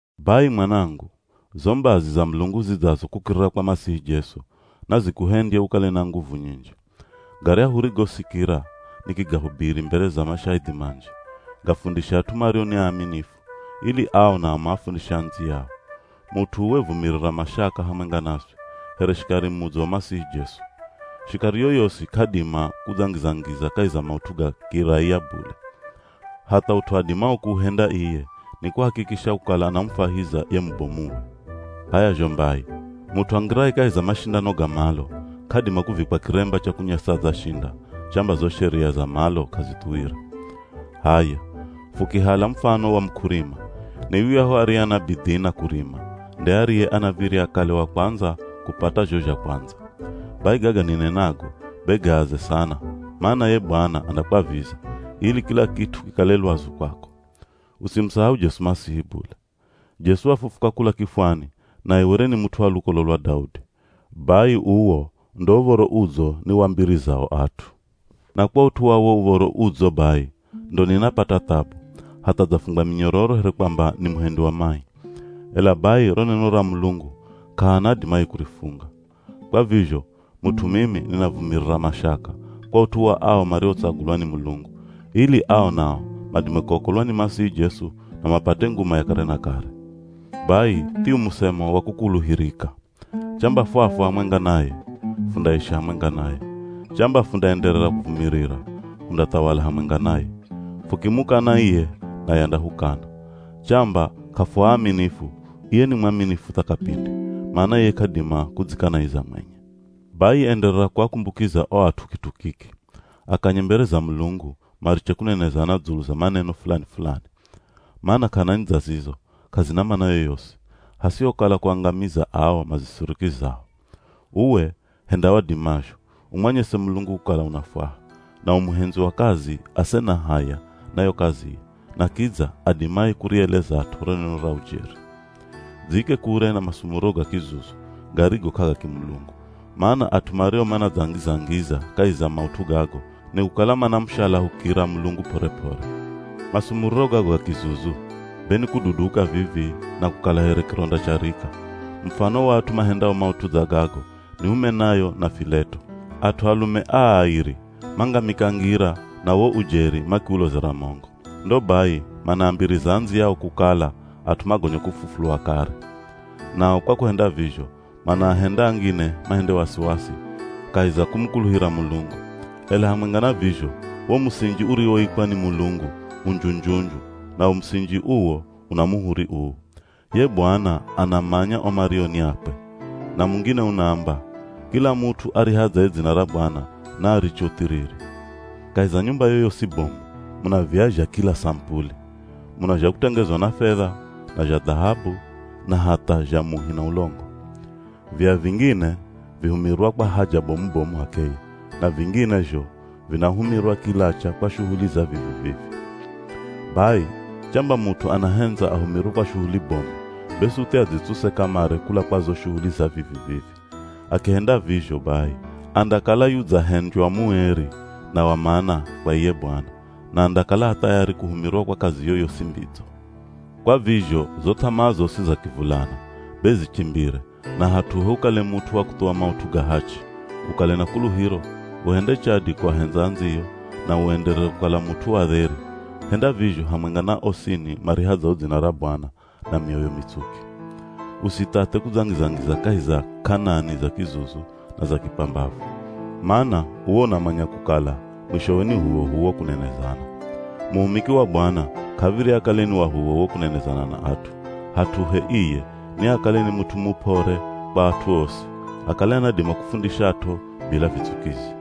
Bai mwanangu, zo mbazi za Mulungu zidzazo kukirira kwa Masihi Jesu, nazikuhendye ukale na nguvu nyinji. Garyahu urigosikira nikigahubiri mbere za mashahidhi manji, gafundishe at'u mario ni aaminifu, ili ao nao maafundishe andziyao. Mut'u uwe vumirira mashaka hamwenga naswi, here shikari mudzo wa Masihi Jesu. Shikari yoyosi k'adima kudzangiza-ngiza kahi za maut'u ga kiraiya bule. Hatha ut'u adimao kuuhenda iye ni kuhakikisha kukala anamufwahiza ye mubomuwe. H'aya zho mbai, mut'u angiraye kahi za mashindano ga malo, k'adima kuvikwa kiremba cha kunyesa adzashinda, chamba zo sheria za malo k'azithuwire. H'aya, fukihala mufano wa muk'urima, ni yuyahu ariye ana bidhii na kurima nde ariye anav̱irya akale wa kwandza kupata zho zha kwandza. Bai gaga ninenago be gaaze sana mana ye Bwana andakwaviza, ili kila kit'u kikale lwazu kwako. Usimusahau Jesu Masihi bule. Jesu wafufuka kula kifwani, naye were ni mut'u wa lukolo lwa Daudi. Bai uwo ndo Uv̱oro Udzo niwambirizao at'u. Na kwa ut'u wa wo Uv̱oro Udzo bai, ndo ninapata thabu, hatha dzafungwa minyororo here kwamba ni muhendi wa mai. Ela bai ro neno ra Mulungu k'ahana adimaye kurifunga. Kwa vizho, mut'u mimi ninavumirira mashaka, kwa ut'u wa ao mariotsagulwa ni Mulungu, ili ao nao madime kuokolwa ni Masihi Jesu na mapate nguma ya kare na kare. Bai thiu musemo wa kukuluhirika. Chamba fwafwa hamwenga naye, fundaishi hamwenga naye. Chamba fundaenderera kuvumirira, hundathawala hamwenga naye. Fukimukana iye naye andahukana. Chamba k'afuaaminifu, iye ni mwaminifu tha kapindi, mana iye k'adima kudzikanaiza mwenye. Bai enderera kuakumbukiza o at'u kit'u kiki; Akanye mbere za Mulungu mariche kunenezana dzulu za maneno fulani-fulani. Mana k'anani dza zizo, k'azina mana yoyosi, hasihokala kuangamiza ao mazisirikizao. Uwe, henda wadimazho, umwanyese Mulungu kukala unafwaha, na u muhendzi wa kazi ase na haya na yo kaziye na kidza adimaye kurielezat'o ro neno ra ujeri. Dziike kure na masumuriro ga kizuzu garigo k'agakimulungu, mana at'u mario manadzangiza-ngiza kahi za maut'u gago nikukala manamushalahukira Mulungu p'ore-p'ore. Masumuriro gago ga kizuzu, be ni kududuka vivii, na kukala here kironda cha rika. Mufano wa at'u mahendao maut'u dza gago ni Humenayo na Fileto. At'u alume aa airi mangamika ngira na wo ujeri makiulozera mongo. Ndo bai manaambiriza andziyao kukala at'u magonya kufufulwa kare. Nao kwa kuhenda vizho manaahenda angine mahende wasiwasi kahi za kumukuluhira Mulungu. Ela hamwenga na vizho wo musinji uriwoikwa ni Mulungu, u nju-nju-nju, nawo musinji uwo una muhuri uu: “Ye Bwana anamanya o mario ni akwe” na mungine unaamba, “Kila mut'u arihadzaye dzina ra Bwana naariche uthiriri.” Kahi za nyumba yoyosi bomu, muna viya zha kila samupuli. Muna zha kutengezwa na fedha, na zha dhahabu, na hatha zha muhi na ulongo. Viya vingine vihumirwa kwa haja bomu-bomu h'akeye, na vingine zho vinahumirwa kilacha kwa shuhuli za vivi-vivi. Bai chamba mut'u anahendza ahumirwe kwa shuhuli bomu, be suthi adzitsuse kamare kula kwa zo shuhuli za vivi-vivi. Akihenda vizho bai, andakala yudzahendywa mueri na wa mana kwa iye Bwana, na andakala a thayari kuhumirwa kwa kazi yoyosi mbidzo. Kwa vizho zo th'amaa zosi za kivulana, be zichimbire na hat'uhe ukale mut'u wa kuthuwa maut'u ga hachi, ukale na kuluhiro, uhende chadi kuahendza andziyo, na uenderere kukala mut'u wa dheri, henda vizho hamwenga na osini marihadzao dzina ra Bwana, na mioyo mitsuki. Usithathe, kudzangiza-ngiza kahi za k'anani za kizuzu na za kipambavu, mana uwe unamanya kukala mwishowe ni h'uwoh'uwo kunenezana Muhumiki wa Bwana k'av̱irya akale ni wa h'uwoh'uwo kunenezana na at'u, hat'uhe iye, niakale ni mut'u mup'ore kwa at'u osi, akale anadima kufundishat'o bila vitsukizi.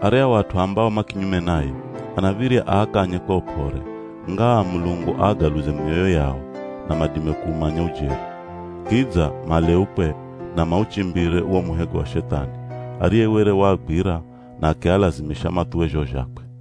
Aryahu at'u ambao ma kinyume naye, anav̱irya aakanye kwa up'ore ngaa Mulungu aagaluze mioyo yao na madime kuumanya ujeri, Kidza maleukwe na mauchimbire wo muhego wa Shethani, ariye were waagwira na akialazimisha mathuwe zho zhakwe.